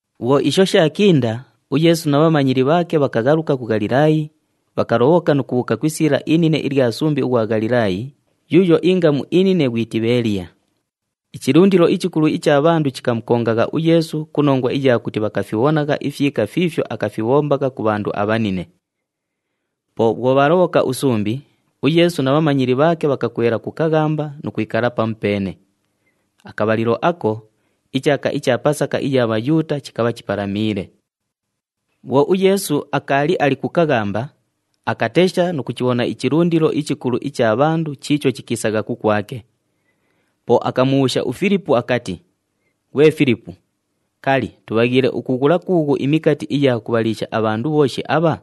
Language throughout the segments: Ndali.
Bhwo isho shaakinda, uYeesu na bhamanyili bhaake bhakaghaluka ku Ghalilaayi, bhakalobhoka nu kubhuuka ku isiila inine ilya sumbi ughwa Ghalilaayi yuuyo ingamu inine ghwi Tibheeliya. Ichilundilo ichikulu icha bhandu chikamukongagha uYeesu ku nongwa iya kuti bhakafibhonagha ifyika fiifyo akafibhombagha ku bhandu abhabhine. Po bhwo bhaalobhoka usumbi, uYeesu na bhamanyili bhaake bhakakwela ku kaghamba nu kwikala pamupeene. Akabhalilo ako, ichaaka icha Pasaka iya Bhayuuta chikabha chipalamiile. Bhwo uYeesu akaali ali ku kaghamba, akatesha nu kuchibhona ichilundilo ichikulu icha bhandu chiicho chikiisagha kukwake. Po akamubhuusha uFilipu akati, “Ghwe Filipu, kali, tubhaghiile ukughula kuughu imikati iya kubhaliisha abhandu bhooshi abha?”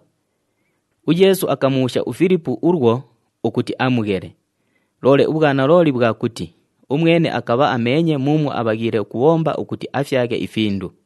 UYeesu akamubhuusha uFilipu ulwo ukuti amughele, loole ubhwanalooli bhwa kuti umwene akabha ameenye muumwo abhaghiile ukubhomba ukuti afyaghe ifindu.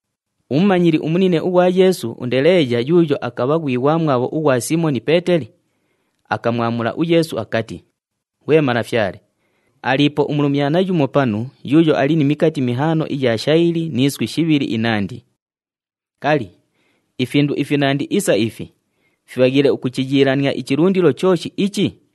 Umumanyili umunine ughwa Yeesu, uNdeleeya, yuuyo akabha ghwi ghwamwabho ghwa Siimoni Peeteli, akamwamula uYeesu akati, “Ghwe Malafyale, aliipo umulumyana yumo panu yuuyo ali ni mikati mihaano iya shayili ni iswi shibhili inandi. Kali, ifindu ifinandi isa ifi fibhaghiile ukuchiyiilania ichilundilo chooshi ichi?”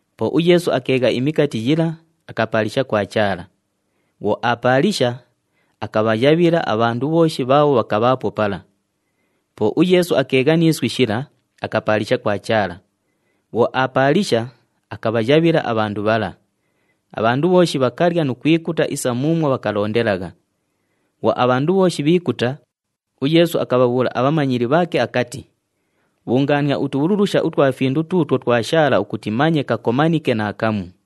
Po uYeesu akeegha imikati yila, akapaalisha kwa Chaala. Bhwo aapaalisha, akabhayabhila abhandu bhooshi bhaabho bhakabhaapo pala. Po uYeesu akeegha ni iswi shila, akapaalisha kwa Chaala. Bhwo aapaalisha, akabhayabhila abhandu bhala. Abhandu bhooshi bhakalya nu kwikuta isa muumwo bhakalondelagha. Bhwo abhandu bhooshi bhiikuta, uYeesu akabhabhuula abhamanyili bhaake akati, “Bhungaania utubhululusha utwa findu tuutwo twashaala ukuti manye kakomanike naakamu.”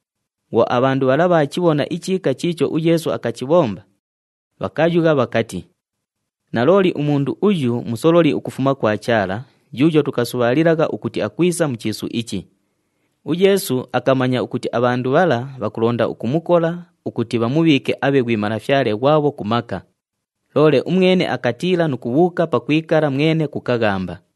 Bhwo abhandu bhala bhaachibhona ichiika chiicho uYeesu akachibhomba, bhakayugha bhakati, “Nalooli umundu uyu musololi ukufuma kwa Chaala yuuyo tukasubhaalilagha ukuti akwisa mu chiisu ichi.” UYeesu akamanya ukuti abhandu bhala bhakulonda ukumukola ukuti bhamubhiike abhe ghwi Malafyale ghwabho ku maka, loole umwene akatiila nu kubhuuka pakwikala mwene ku kaghamba.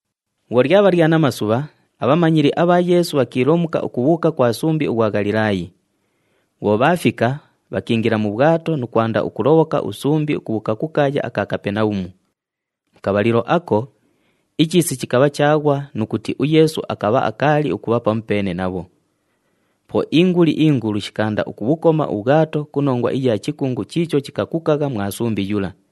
Bhwo lyabha lya namasubha, abhamanyili abha Yeesu bhakiilomuka ukubhuuka kwa sumbi ughwa Ghalilaayi. Bhwo bhaafika, bhakiingila mu bhwato nu kwanda ukulobhoka usumbi ukubhuuka ku kaaya aka Kapenabhumu. Mu kabhalilo ako, ichiisi chikabha chaaghwa nu kuti uYeesu akabha akaali ukubha pamupeene nabho. Po inguli ingulu shikaanda ukubhukoma ubhwato ku nongwa iya chikungu chiicho chikakukagha mwa sumbi yula.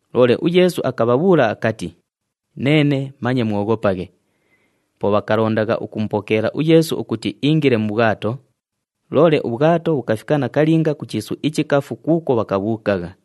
Loole uYeesu akabhabhuula akati, “Neene, manye mwoghopaghe!” Po bhakalondagha ukumupokeela uYeesu ukuti iingile mu bhwato, loole ubhwato bhukafika nakalinga ku chiisu ichikafu kuukwo bhakabhuukagha.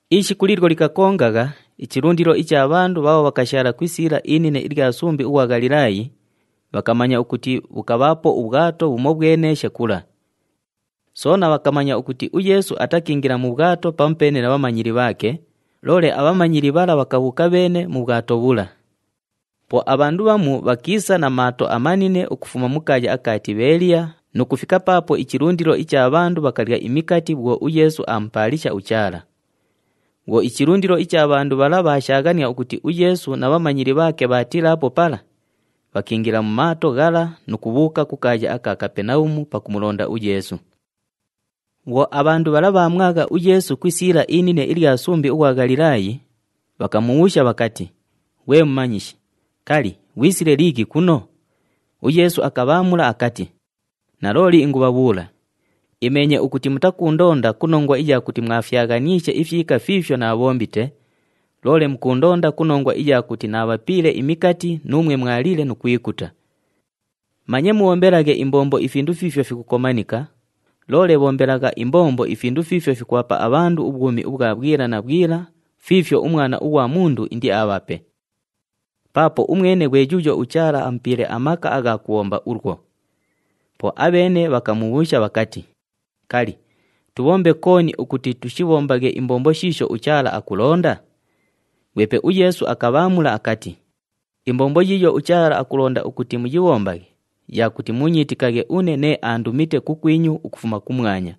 Ishiku liilyo likakongagha, ichilundilo icha bhandu bhaabho bhakashaala ku isiila inine ilya sumbi ughwa Ghalilaayi, bhakamanya ukuti bhukabhaapo ubhwato bhumobhweneeshe kula. Soona bhakamanya ukuti uYeesu atakiingila mu bhwato pamupeene na bhamanyili bhaake, loole abhamanyili bhala bhakabhuuka bheene mu bhwato bhula. Po abhandu bhamu bhakiisa na maato amanine ukufuma mu kaaya aka Tibheeliya nu kufika paapo ichilundilo icha bhandu bhakalya imikati bhwo uYeesu aamupaalisha uChaala. Bhwo ichilundilo icha bhandu bhala bhaashaaghania ukuti uYeesu na bhamanyili bhaake bhataliipo pala, bhakiingila mu maato ghala nu kubhuuka ku kaaya aka Kapenabhumu pakumulonda uYeesu. Bhwo abhandu bhala bhaamwagha uYeesu ku isiila inine ilya sumbi ughwa Ghalilaayi, bhakamubhuusha bhakati, “Ghwe Mumanyishi, kali, ghwisile liighi kuno?” UYeesu akabhaamula akati, “Nalooli ingubhabhuula, imeenye ukuti mutakuundonda ku nongwa iya kuti mwafyaghaniishe ifyika fiifyo naabhombite, loole mukuundonda ku nongwa iya kuti naabhapiile imikati nuumwe mwaliile nu kwikuta. Manye mubhombelaghe imbombo ifindu fiifyo fikukomanika, loole bhombelagha imbombo ifindu fiifyo fikubhapa abhandu ubhwumi ubhwa bhwila na bhwila fiifyo uMwana ughwa Mundu indiabhape. Paapo umwene ghwe yuuyo uChaala amupiile amaka agha kubhomba ulwo.” Po abheene bhakamubhuusha bhakati, “Kali, tubhombe kooni ukuti tushibhombaghe imbombo shiisho uChaala akulonda?” Ghwepe uYeesu akabhaamula akati, “Imbombo yiiyo uChaala akulonda ukuti muyibhombaghe ya kuti muunyiitikaghe une nee aandumite kukwinyu ukufuma kumwanya.”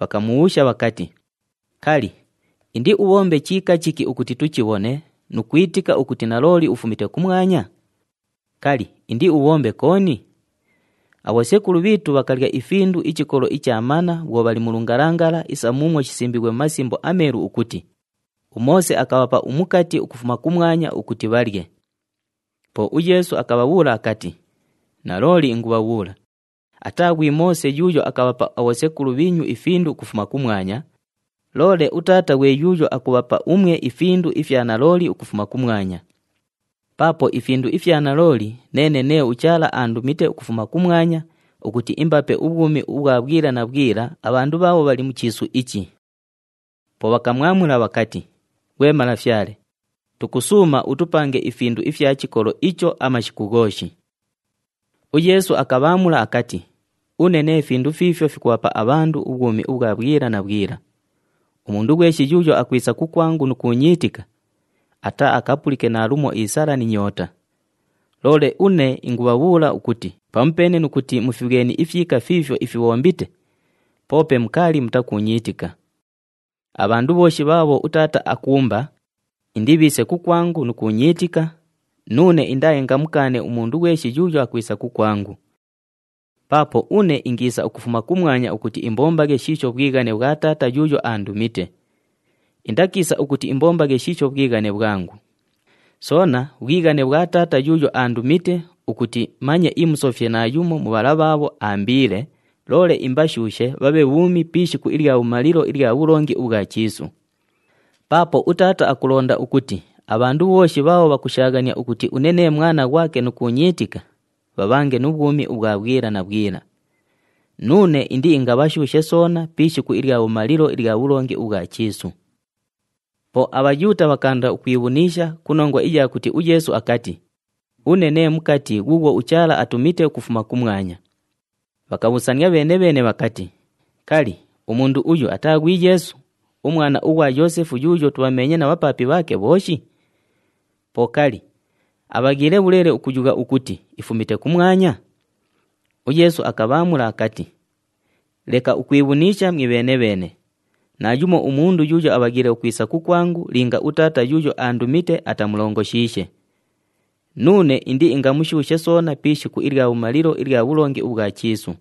Bhakamubhuusha bhakati, “Kali, indiubhombe chiika chiki ukuti tuchibhone nu kwitika ukuti nalooli ufumite kumwanya? Kali, indiubhombe kooni? Abhosekulu bhiitu bhakalya ifindu ichikolo icha mana bhwo bhali mu lungalangala isa muumwo shisimbiighwe mu Masimbo aMeelu ukuti, ‘UMoose akabhapa umukati ukufuma kumwanya ukuti bhalye.’” Po uYeesu akabhabhuula akati, “Nalooli ingubhabhuula, ataa ghwi Moose yuuyo akabhapa abhosekulu bhiinyu ifindu ukufuma kumwanya, loole uTaata ghwe yuuyo akubhapa umwe ifindu ifya nalooli ukufuma kumwanya. Paapo ifindu ifya nalooli neene nee uChaala aandumite ukufuma kumwanya ukuti imbape ubhwumi ubhwa bhwila na bhwila abhandu bhaabho bhali mu chiisu ichi.” Po bhakamwamula bhakati, “Ghwe Malafyale, tukusuuma utupange ifindu ifya chikolo icho amashiku ghooshi.” UYeesu akabhaamula akati, “Une nee findu fiifyo fikubhapa abhandu ubhwumi ubhwa bhwila na bhwila. Umundu ghweshi yuuyo akwisa kukwangu nu kuunyiitika, ataaakapulike naalumo isala ni nyoota. Loole une ingabhabhuula ukuti pamupeene nu kuti mufibhweni ifyika fiifyo ifibhombite, poope mukaali mutakuunyiitika. Abhandu bhooshi bhaabho uTaata akuumba, indibhiise kukwangu nu kuunyiitika, nuune indaaingamukaane umundu ghweshi yuuyo akwisa kukwangu. Paapo une ingiisa ukufuma kumwanya ukuti imbombaghe shiisho bhwighane bhwa Taata yuuyo aandumite. Indakiisa ukuti imbombaghe shiisho bhwighane bhwangu. Soona bhwighane bhwa Taata yuuyo aandumite ukuti manye imusofye naayumo mu bhala bhaabho aambiile, loole imbashuushe bhabhe bhuumi pi ishiku ilya bhumalilo ilya bhulongi ubhwa chiisu. Paapo uTaata akulonda ukuti abhandu bhooshi bhaabho bhakushaaghania ukuti une nee Mwana ghwake nu kuunyiitika, bhabhange nu bhwumi ubhwa bhwila na bhwila. Nuune indiingabhashuushe soona pi ishiku ilya bhumalilo ilya bhulongi ubhwa chiisu.” Po aBhayuuta bhakaanda ukwibhuniisha ku nongwa iya kuti uYeesu akati, “Une nee mukati ghuughwo uChaala atumite ukufuma kumwanya.” Bhakabhuusania bheene-bheene bhakati, “Kali, umundu uyu ataa ghwi Yeesu, umwana ughwa Yoosefu yuuyo tubhameenye na bhapaapi bhaake bhooshi? Po kali, abhaghiile bhuleele ukuyugha ukuti, ‘Ifumite kumwanya’?” UYeesu akabhaamula akati, “Leka ukwibhuniisha mwibheene-bheene. Naayumo umundu yuuyo abhaghiile ukwisa kukwangu linga uTaata yuuyo aandumite atamulongoshiishe. Nuune indiingamushuushe soona pi ishiku ilya bhumalilo ilya bhulongi ubhwa chiisu.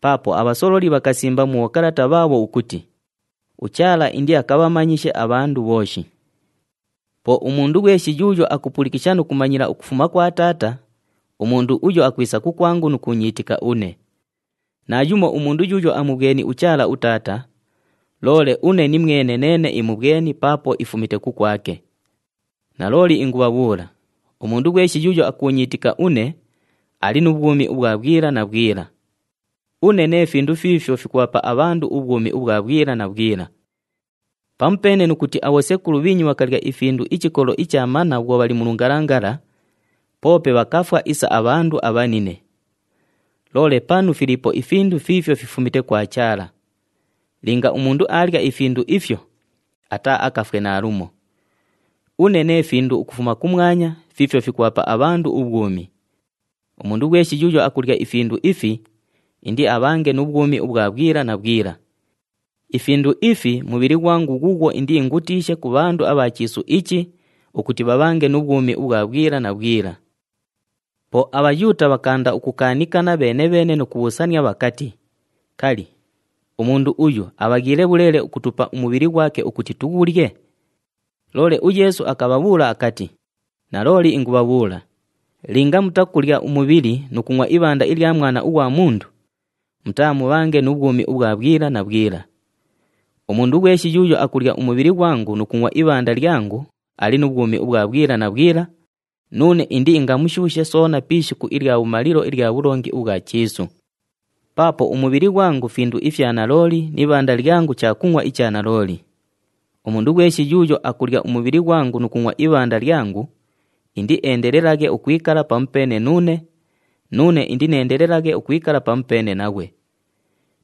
Paapo abhasololi bhakasimba mu bhokalata bhaabho ukuti, ‘UChaala indiakabhamanyishe abhandu bhooshi.’ Po umundu ghweshi yuuyo akupulikisha nu kumanyila ukufuma kwa Taata, umundu uyo akwisa kukwangu nu kuunyiitika une. Naayumo umundu yuuyo amubhweni uChaala uTaata, loole une nimwene neene imubhweni paapo ifumite kukwake. Nalooli ingubhabhuula, umundu ghweshi yuuyo akuunyiitika une, ali nu bhwumi ubhwa bhwila na bhwila. Une nee findu fiifyo fikubhapa abhandu ubhwumi ubhwa bhwila na bhwila. Pamupeene nu kuti abhosekulu bhiinyu bhakalya ifindu ichikolo icha mana bhwo bhali mu lungalangala, poope bhakafwa isa abhandu abhanine. Loole panu filiipo ifindu fiifyo fifumite kwa Chaala. Linga umundu aalya ifindu ifyo, ataaakafwe naalumo. Une nee findu ukufuma kumwanya fiifyo fikubhapa abhandu ubhwumi. Umundu ghweshi yuuyo akulya ifindu ifi, indiabhange nu bhwumi ubhwa bhwila na bhwila. Ifindu ifi mubhili ghwangu ghuughwo indiingutiishe ku bhandu abha chiisu ichi ukuti bhabhange nu bhwumi ubhwa bhwila na bhwila.” Po aBhayuuta bhakaanda ukukaanikana bheene-bheene nu kubhuusania bhakati, “Kali, umundu uyu abhaghiile bhuleele ukutupa umubhili ghwake ukuti tughulye?” Loole uYeesu akabhabhuula akati, “Nalooli ingubhabhuula, linga mutakulya umubhili nu kungʼwa ibhanda ilya Mwana ughwa Mundu, mutaamubhange nu bhwumi ubhwa bhwila na bhwila. Umundu ghweshi yuuyo akulya umubhili ghwangu nu kungʼwa ibhanda lyangu ali nu bhwumi ubhwa bhwila na bhwila, nuune indiingamushuushe soona pi ishiku ilya bhumalilo ilya bhulongi ubhwa chiisu. Paapo umubhili ghwangu findu ifya nalooli ni ibhanda lyangu chakungʼwa icha nalooli. Umundu ghweshi yuuyo akulya umubhili ghwangu nu kungʼwa ibhanda lyangu, indieendelelaghe ukwikala pamupeene nuune, nuune indineendelelaghe ukwikala pamupeene naghwe.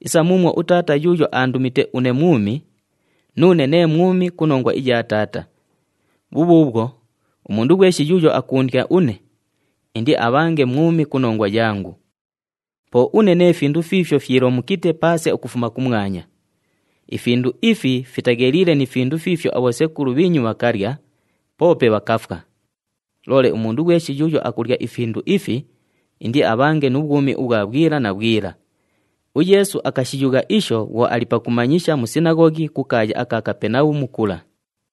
Isa muumwo uTaata yuuyo aandumite une mwumi, nuune nee mwumi ku nongwa iya Taata. Bhubhuubhwo, umundu ghweshi yuuyo akuundya une, indiabhange mwumi ku nongwa yangu. Po une nee findu fiifyo fyilomukite paase ukufuma kumwanya. Ifindu ifi fitagheliile ni findu fiifyo abhosekulu bhiinyu bhakalya, poope bhakafwa. Loole umundu ghweshi yuuyo akulya ifindu ifi, indiabhange nu bhwumi ubhwa bhwila na bhwila.” UYeesu akashiyugha isho bhwo ali pakumanyisha mu sinaghoghi ku kaaya aka Kapenabhumu kula.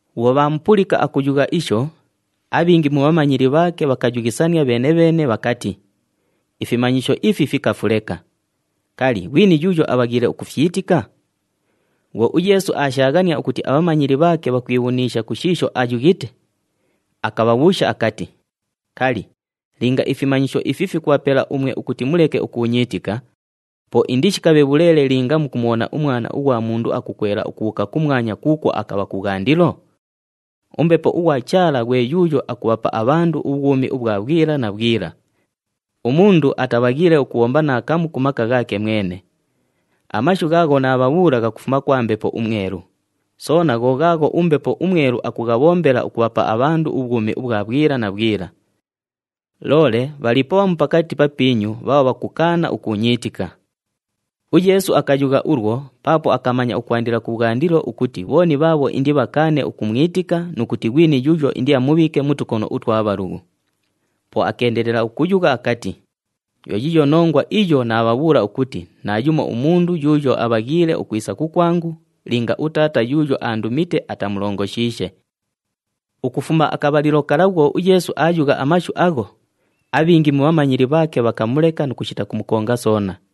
Bhwo bhaamupulika akuyugha isho, abhingi mu bhamanyili bhaake bhakayughisania bheene-bheene bhakati, “Ifimanyisho ifi fikafu leka! Kali, ghwini yuuyo abhaghiile ukufyitika?” Bhwo uYeesu aashaaghania ukuti abhamanyili bhaake bhakwibhuniisha ku shiisho ayughite, akabhabhuusha akati, “Kali, linga ifimanyisho ifi fikubhapela umwe ukuti muleke ukuunyiitika, po indishikabhe bhuleele linga mukumubhona uMwana ughwa Mundu akukwela ukubhuuka kumwanya kuukwo akabha kubhwandilo? UMbepo ughwa Chaala ghwe yuuyo akubhapa abhandu ubhwumi ubhwa bhwila na bhwila. Umundu atabhaghiile ukubhomba naakamu ku maka ghaake mwene. Amashu ghaagho naabhabhuula ghakufuma kwa Mbepo uMwelu, soona gho ghaagho uMbepo uMwelu akughabhombela ukubhapa abhandu ubhwumi ubhwa bhwila na bhwila. Loole bhaliipo bhamu pakati papiinyu bhaabho bhakukaana ukuunyiitika.” UYeesu akayugha ulwo paapo akamanya ukwandila kubhwandilo ukuti bhooni bhaabho indibhakaane ukumwitika, nu kuti ghwini yuuyo indiamubhiike mu tukono utwa bhalughu. Po akeendelela ukuyugha akati, “Yo yiiyo nongwa iyo naabhabhuula ukuti naayumo umundu yuuyo abhaghiile ukwisa kukwangu linga uTaata yuuyo aandumite atamulongoshiishe.” Ukufuma akabhalilo kala bhwo uYeesu aayugha amashu agho, abhingi mu bhamanyili bhaake bhakamuleka nu kushita kumukonga soona.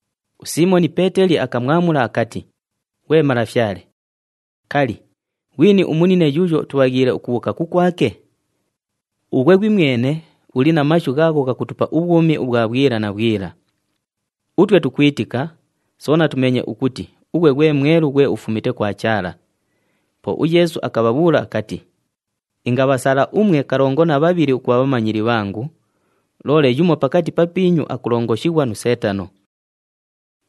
USiimoni Peeteli akamwamula akati, “Ghwe Malafyale, kali, ghwini umunine yuuyo tubhaghiile ukubhuuka kukwake? Ughwe ghwimwene uli na mashu ghaagho ghakutupa ubhwumi ubhwa bhwila na bhwila. Utwe tukwitika, soona tumeenye ukuti ughwe ghwe Mwelu ghwe ufumite kwa Chaala.” Po uYeesu akabhabhuula akati, “Ingabhasala umwe kalongo na bhabhili ukubha bhamanyili bhangu, loole yumo pakati papiinyu akulongoshighwa nu Seetano.”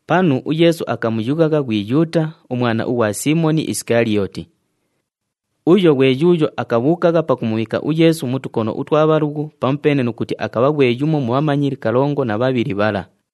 Panu uYeesu akamuyughagha ghwi Yuuta, umwana ughwa Siimoni Isikaliyooti. Uyo ghwe yuuyo akabhuukagha pakumubhiika uYeesu mu tukono utwa bhalughu pamupeene nu kuti akabha ghwe yumo mu bhamanyili kalongo na bhabhili bhala.